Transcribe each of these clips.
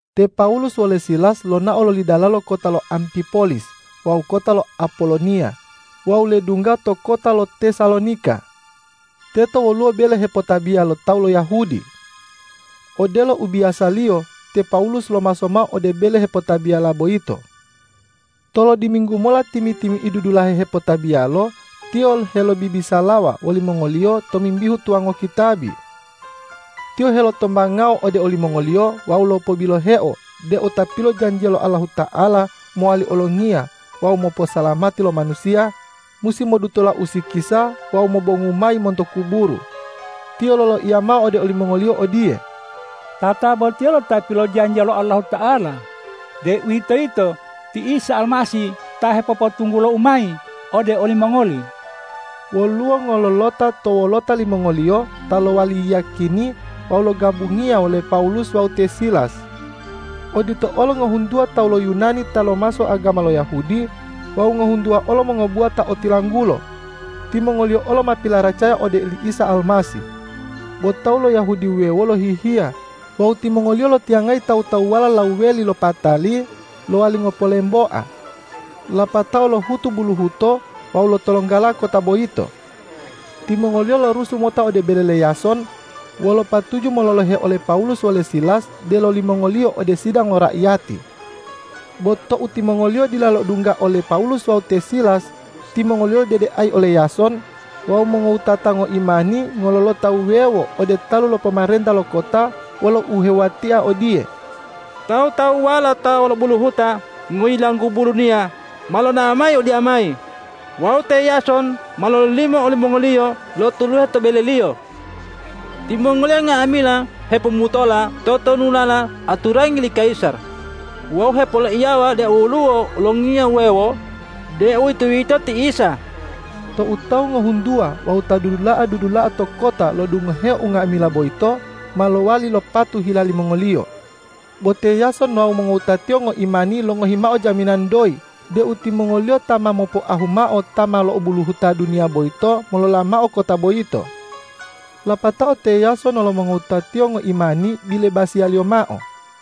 Te Pawulus wole Silas lonao loli dalalo kota lo Ampipolis wawu kota lo Apoloniya wawu ledungga to kota lo Tesalonika. Teto woluwo bele hepotabiya lo tawu lo Yahudi. Odelo u biyasaliyo, te Pawulus lomaso mao ode bele hepotabiyala boyito. Tolodiminggu mola timi-timi'idu dulahe hepotabiyalo tiyo helobibisalawa wolimongoliyo tomimbihu tuwango kitabi. Tiyo helotombangao ode olimongoliyo wawu lopobiloheo deu Ta pilojanjiya lo Allahuta'ala mowali Olongiya wawu moposalamati lo manusiya, musi modutola usikisa wawu mobongu mayi monto kuburu. Tiyo loloiya mao ode olimongoliyo odiye,”Tatabotiyelo Ta pilojanjiya lo Allahuta'ala, deuwitoyito ti Isa Almasih ta hepopotunggulou mayi ode olimongoli.” Woluwo ngololota to wolota limongoliyo ta lowali yiyakini wawu logabungiya wole Pawulus wawu te Silas. Odito olo ngohuntuwa tawu lo Yunani ta lomaso agama lo Yahudi wawu ngohuntuwa olo mongobuwa ta otilanggulo. Timongoliyo olo ma pilaracaya ode oli Isa Almasih. Bo tawu lo Yahudi wuwewo lohihiya wawu timongoliyo lotiyangayi tawu-tawuwala lawuweli lo patali lowali ngopolemboa, lapatao lohutu buluhuto wawu lotolonggala kota boyito. Timongoliyo lorusu mota ode bele le Yason wolo patuju mololohe ole Pawulus wole Silas delo limongoliyo ode sidang lo raiyati. Bo tou timongoliyo dila lo'odungga ole Pawulus wawu te Silas, timongoliyo lodedeayi ole Yason wawu mongowutata ngoimani ngololota wuwewo ode talu lo pomarenta lo kota, wolo uhewuwatia odiye,”Tawu-tawuwala ta lo'obuluhuta ngoyilanggubu duniya ma lonao mayi odiyamayi wawu te Yason ma lololimo olimongoliyo lotuluhe to beleliyo. Timongoliyo nga'amila hepomutola totonulala aturangi li kayisar wawu hepoloiyawa deu woluwo olongiya wuwewo, deuwitoyito ti Isa.” Tou tawu ngohuntuwa wawu ta dudula'a-dudula'a to kota lo'odungoheo unga'amila boyito, ma lowali lopatu hila limongoliyo. Bo te Yason wawu mongowutatiyo ngoimani longohi mao jaminan doyi deu timongoliyo ta ma mopoahu mao ta ma lo'obuluhuta duniya boyito molola mao kota boyito. Lapatao te Yason wolo mongowutatiyo ngoimani bilebasiyaliyo mao.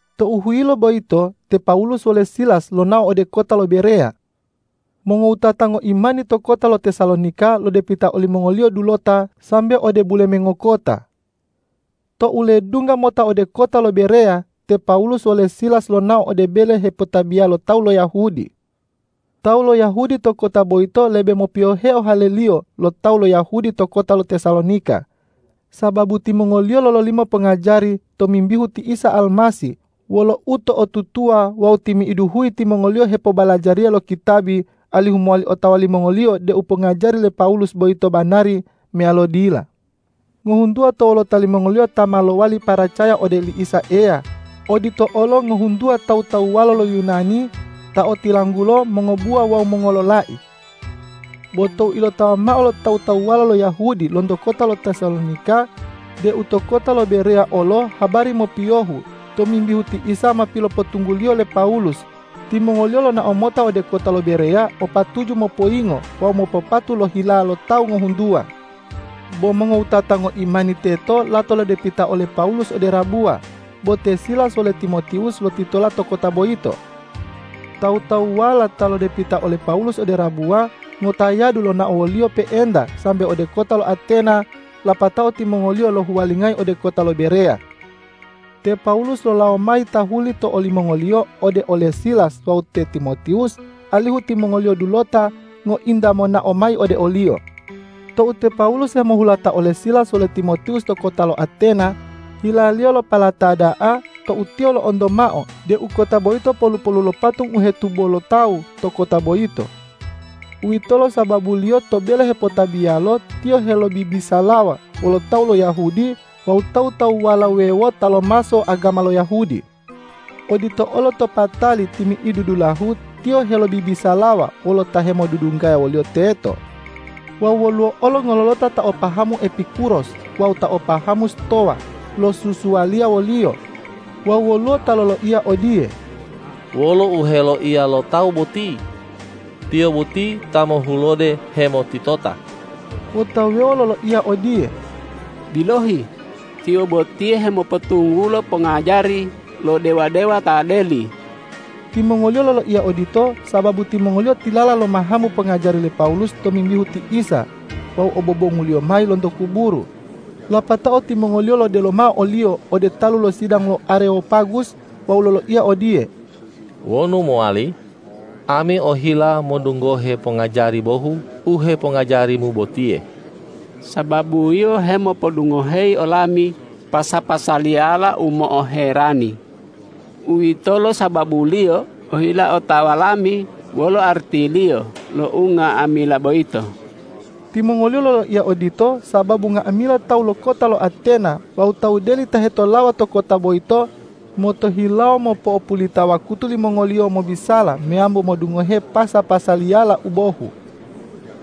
Tou huyilo boyito te Pawulus wole Silas lonao ode kota lo Bereya. Mongowutata ngoimani to kota lo Tesalonika lodepita olimongoliyo dulota sambe ode bulemengo kota. Tou ledungga mota ode kota lo Bereya, te Pawulus wole Silas lonao ode bele hepotabiya lo tawu lo Yahudi. Tawu lo Yahudi to kota boyito lebe mopiyoheo haleliyo lo tawu lo Yahudi to kota lo Tesalonika, sababu timongoliyo lololimo pongajari tomimbihu ti Isa Almasih wolo uto'otutuwa wawu timi'idu huyi timongoliyo hepobalajariya lo kitabi, alihu mowali otawa limongoliyo deu pongajari le Pawulus boyito banari meyalo dila. Ngohuntuwa to wolota limongoliyo ta ma lowali paracaya ode oli Isa Eya, odito olo ngohuntuwa tawu-tawuwala lo Yunani ta otilanggulo mongobuwa wawu mongololai. Bo tou ilotawa mao lo tawu-tawuwala lo Yahudi lonto kota lo Tesalonika deu to kota lo Bereya olo habari mopiyohu tomimbihu ti Isa ma pilopotungguliyo le Pawulus, timongoliyo lonao mota ode kota lo Bereya o patuju mopoyingo wawu mopopatu lo hila lo tawu ngohuntuwa. Bo mongowutata ngoimani teto lato lodepita ole Pawulus ode rabuwa, bo te Silas wole Timotiwus lotitola to kota boyito. Tawu-tawuwala ta lodepita ole Pawulus ode rabuwa, ngotayadu lonao woliyo pe'enta sambe ode kota lo Atena, lapatao timongoliyo lohuwalingayi ode kota lo Bereya. Te Pawulus lolawo mayi tahuli to olimongoliyo ode ole Silas wawu te Timotiwus, alihu timongoliyo dulota ngointa monao mayi ode oliyo. Tou te Pawulus hemohulata ole Silas wole Timotiwus to kota lo Atena, hilaliyo lopalata da'a tou tiyo lo'onto mao deu kota boyito polu-polu lo patung u hetubo lo tawu to kota boyito. Uwitolo sababuliyo to bele hepotabiyalo tiyo helobibisalawa wolo tawu lo Yahudi wawu tawu-tawuwala wuwewo ta lomaso agama lo Yahudi. Odito olo to patali timi'idu dulahu tiyo helobibisalawa wolo ta hemodudunggaya woliyo teto. Wawu woluwo ngololota ta o pahamu Epikuros wawu ta o pahamu Stowa losusualiya woliyo. Wawu woluwo ta loloiya odiye,”Wolo u heloiya lo tawu boti? Tiyo boti ta mohulode hemotitota.” Bo ta wuwewo loloiya odiye,”Bilohi, tiyo botiye hemopotunggulo pongajari lo dewa-dewa ta deli.” Timongoliyo loloiya odito, sababu timongoliyo tilala lomahamu pongajari le Pawulus tomimbihu ti Isa wawu obobongu-Liyo mayi lonto kuburu. Lapatao timongoliyo lodelo mao oliyo ode talu lo sidang to Arewopagus wawu loloiya odiye,”Wonu mowali, ami ohila modungohe pongajari bohu u hepongajarimu botiye. Sababu yio hemopodungoheyi olami pasa-pasaliyala u mo'oherani. Uwitolo sababuliyo ohila otawa lami wolo artiliyo lo unga'amila boyito.” Timongoliyo loloiya odito sababu nga'amila tawu lo kota lo Atena wawu tawu deli ta hetolawa to kota boyito motohilawo mopo'opulita wakutu limongoliyo mobisala meyambo modungohe pasa-pasaliyala u bohu.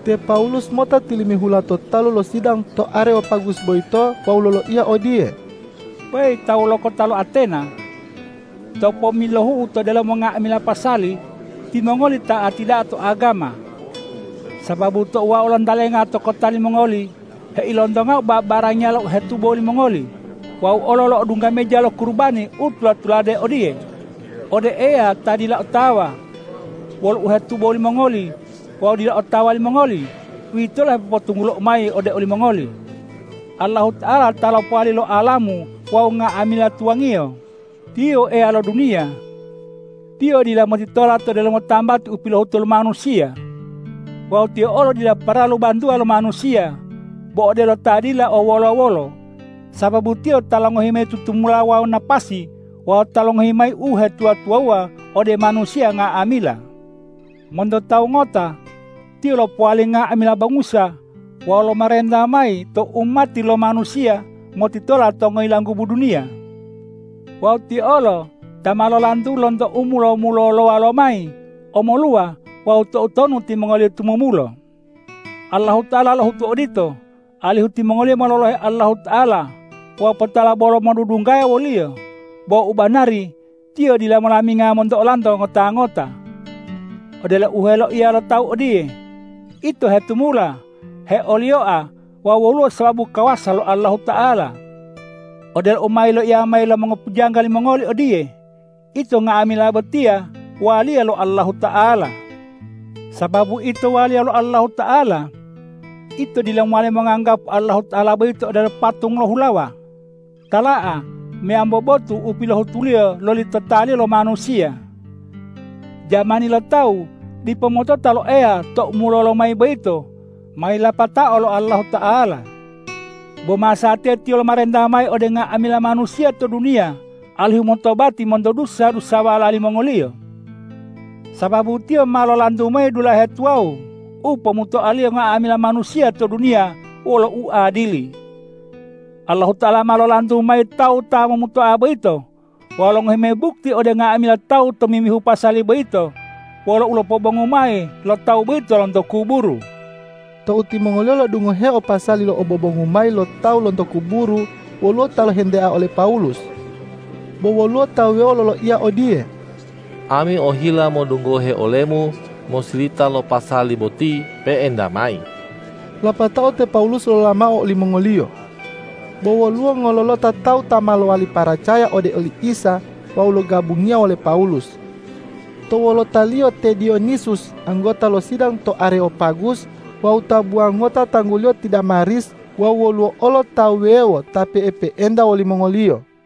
Te Pawulus mota tilimihula to talu lo sidang to Arewopagus boyito wawu loloiya odiye,”Weyi tawu lo kota lo Atena! To pommilohu'u to delomo nga'amila pasali, timongoli ta'ati da'a to agama. Sababu tou wau lontalenga to kota limongoli heilontongau babarangiyala u hetubo limongoli, wau olo lo'odungga meja lo kurubani u tula-tulade odiye, ’Ode Eya ta dila otawa.’ Wolo u hetubo limongoli wawu dila otawa limongoli, uwitolo u hepopotunggulou mayi ode olimongoli. Allahuta'ala ta lopowali lo alamu wawu nga'amila tuwangiyo, Tiyo Eya lo duniya. Tiyo dila motitola to delomo tambati u pilohutu lo manusiya. Wawu Tiyo olo dila paralu bantuwa lo manusiya bo odelo ta dila o wolo-wolo, sababu Tiyo ta longohi mayi tutumulo wawu napasi wawu ta longohi mayi uhetuwa-tuwawuwa ode manusiya nga'amila. Monto tawu ngota Tiyo lopowali nga'amila bangusa wawu lomarenta mayi to umati lo manusiya motitola to ngoyilanggubu duniya. Wawu Tiyo olo ta ma lolantu lonto u mulo-mulolowa lo mayi omoluwa wawu toutonu timongoliyo tumumulo. Allahuta'ala lohutu odito, alihu timongoliyo mololohe Allahuta'ala wawu potala bolo modudunggaya wo-Liyo, bo u banari Tiyo dila molaminga monto olanto ngota-ngota. Odelo u heloiya lo tawu odiye, ’Ito hetumula, heoliyoa wawu woluwo sababu kawasa lo Allahuta'ala.’ Odelo u ma yiloiya mayi lo mongopujangga limongoli odiye, ’Ito nga'amila botiya waliya lo Allahuta'ala.’ Sababu ito waliya lo Allahuta'ala, ito dila mowali monganggapu Allahuta'ala boyito odelo patung lo hulawa, tala'a meyambo botu u pilohutuliyo loli totaliyo lo manusiya. Jamani lo tawu dipo motota lo Eya tou mulolo mayi boyito ma yilipatao lo Allahuta'ala. Bo masatiya Tiyo lomarenta mayi ode nga'amila manusiya to duniya alihu motobati monto dusa-dusawala limongoliyo. Sababu Tiyo ma lolantu mayi dulahe tuwawu u pomutoa-Liyo nga'amila manusiya to duniya wolo uadili. Allahuta'ala ma lolantu mayi Tawu ta momutoa boyito wawu longohi mayi bukti ode nga'amila tawu tomimbihu pasali boyito wolo ulopobongu mayi lo Tawu boyito lonto kuburu.” Tou timongoliyo lo'odungoheo pasali lo obobongu mayi lo tawu lonto kuburu, woluwo ta lohentea ole Pawulus. Bo woluwo ta wuwewo loloiya odiye,”Ami ohila modungohe olemu mosilita lo pasali boti pe'enta mayi.” Lapatao te Pawulus lolola mao olimongoliyo. Bo woluwo ngololota tawu ta ma lowali paracaya ode oli Isa wawu logabungiya wole Pawulus. To wolotaliyo te Diyonisus anggota lo sidang to Arewopagus, wawu tabuwa ngota tangguliyo ti Damaris wawu woluwo olo ta wuwewo ta pe'epe'enta wolimongoliyo.